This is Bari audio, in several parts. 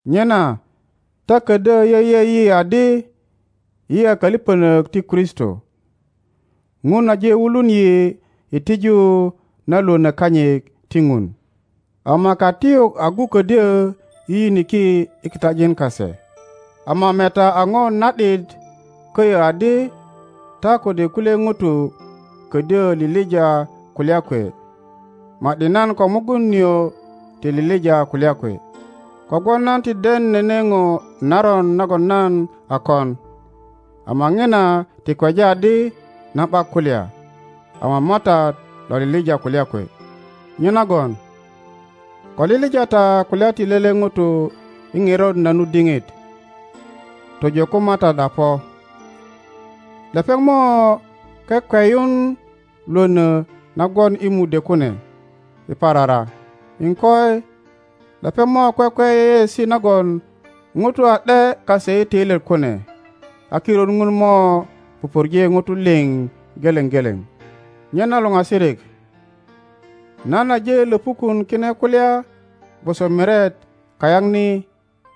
Nyena ta ködyö yeye yi adi yi a kölipönök ti Kristo. Ŋun aje wulun yi i tiju na lwönö kanyit ti Ŋun. Ama katiyuk agu ködyö yiyiniki i kitajin kase. Ama meta a na ’dit köyö adi ta kode kulye ŋutu ködyö lilija kulya kwe, ma ’di nan ko Rigun nio ti lilija kulya kwe. Kogwon nan ti den nene ŋo naron nagon nan a kon, ama ŋina ti kweja adi nan ’bak kulya. Ama Matat lo lilija kulya kwe. Nyenagon ko lilija ta kulya ti lele Ŋuto i ŋerot na nu diŋit, tojo ko Matat a po. Lepeŋ mo kwe kweyun Iwono na gwon i mudwe kune i parara, iŋkoi, lepeŋ mo kwekwe yeyeesi nagon ŋutu a ’de kase i töilyet kune. A kirut Ŋun mo pupurje ŋutu liŋ geleŋ geleŋ. Nyena luŋasirik, nan aje löpukun kine kulya gwoso miret kayaŋ ni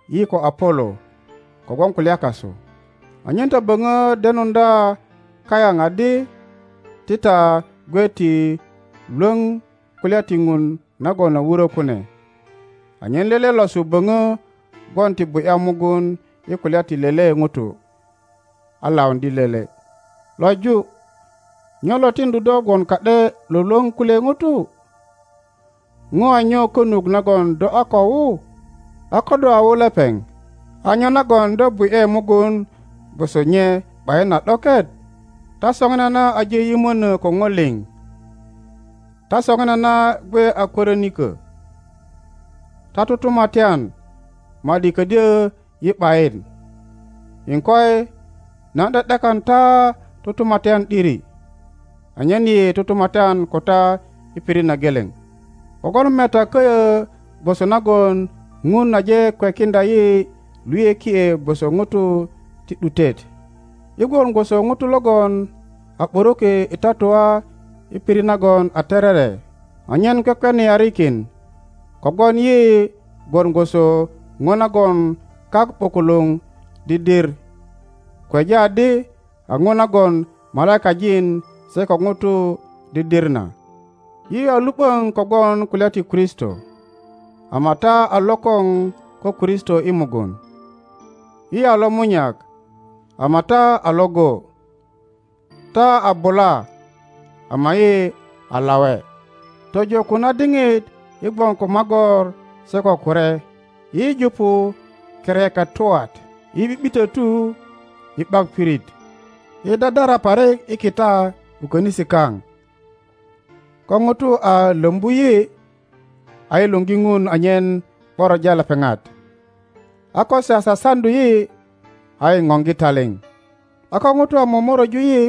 yi ko Apolo kogwon kulya kasu, anyen ta böŋö denuŋdya kayaŋ adi ti ta gwe ti Iwoŋ kulya ti Ŋun nagon a wuro kune, anyen lele losu boŋo gwon ti bu ’ya mugun i kulya ti lele ŋuto a lauŋdye lele. Löju, nyo lo tiŋdu do gwon ka ’de lwölwöŋ kulye ŋutu? Ŋo a nyo konut nagon do a ko wu? A ko do a wu lepeŋ, a nyo nagon do bu ’ye mugun gwoso nye ’bayin a ’doket? Ta soŋinana aje yimöno ko ŋo liŋ, ta soŋinana gwe a kwörinikö, ta tutumatyan, ma ’di kodyö yi ’bayin. Iŋkoi, nan ’de ’dekan ta tutumatyan ’diri anyen yi tutumatyan ko ta i pirit na geleŋ! Kogwon meta köyö gwoso nagon Ŋun aje kwekiŋdya yi luyökie gwoso ŋutu ti ’dutet. Yi gwon gwoso ŋutu logon a ’buruki i tatua i pirit nagon a terere anyen kwekweniarikin, kogwon yi gwon gwoso ŋo nagon kak ’bukuluŋ didir, kweja adi a ŋo nagon malaikajin se ko ŋutu didir na. Yi a lu ’boŋ kogwon kulya ti Kristo, ama ta a lokoŋ ko Kristo i mugun! Yi a lomunyak, ama ta a iŋgo! Ta a bula, ama yi a lawe! Tojo ko na diŋit yi gwon ko magor se ko kure; yi jupu kereketwat, yi ’bi’bitotu; yi ’bak pirit; yi dadara parik i kita ko konisi kaŋ. Ko ŋutu a lombu yi, a yi luŋgi Ŋun anyen ’boroja lepeŋat; a ko se a sasaŋdu yi, a yi ŋoŋgi taliŋ; a ko ŋutu a momoröju yi,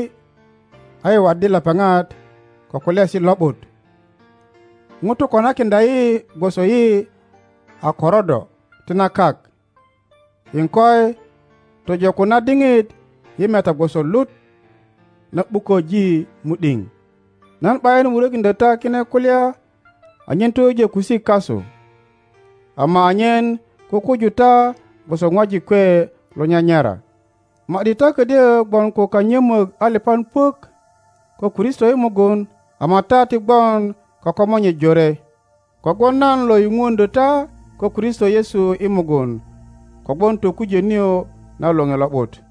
a yi waddi lepeŋat ko kulyaesi lo ’but. Ŋutu konakiŋdya yi gwoso yi a korodo ti na kak, iŋkoi, tojo ko na diŋit yi meta gwoso lut na ’bukoŋ mu ’diŋ. Nan ’bayin wurokiŋdyo ta kine kulya anyen toyujo kusik kasu, ama anyen kukuju ta gwoso ŋwajik kwe lonyanyara. Ma ’di ta ködyö gwon ko kanyömok alipan puök ko Kristo i mugun, ama ta ti gwon ko komonye jore. Kogwon nan lo yupuŋdyö ta ko Kristo Yesu i mugun kogwon tokujö nio na Loŋe Lo ’but.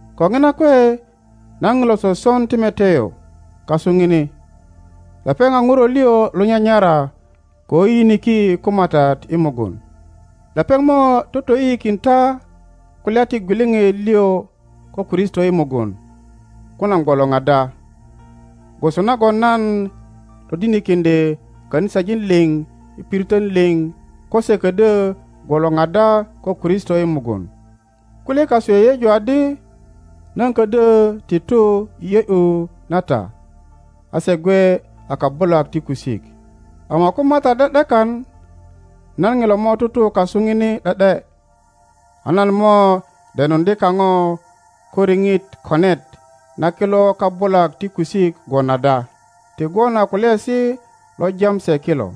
Ko ŋina kwe nan ŋilo soson Timoteo kasu ŋini. Lepeŋ a ŋuro lio lonyanyara ko yiyiniki ko Matat i mugun. Lepeŋ mo totoyiyikin ta kulya ti gwiliŋit lio ko Kristo i mugun ko nan gwolor ada, gwoso nagon nan todinikiŋdye kanisajin liŋ i piritön liŋ ko se ködyo gwolor ada ko Kristo i mugun. Kulye kasu yeyeju adi nan ködyö ti tu i ’yö ’yu na ta, a se gwe a kabulak ti kusik. Ama ko Matat ’de ’dekan, nan ŋilo mo tutu kasu ŋini ’de ’de; a nan mo denuŋdye kaŋo ko riŋit konet na kilo kabulak ti kusik gwon ada, ti gwon a kulyaesi lo jam se kilo.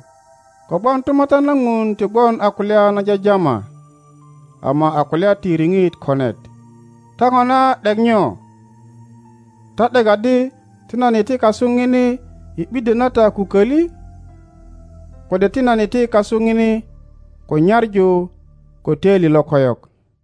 Kogwon tumatyan na Ŋun ti gwon a kulya na jajama, ama a kulya ti riŋit konet. Ta ŋona ’dek nyo? Ta ’dek adi ti nan iti kasu ŋini i ’biddyö na ta ko koli? Kode ti nan iti kasu ŋini ko nyaŋu ko toili lokoyok?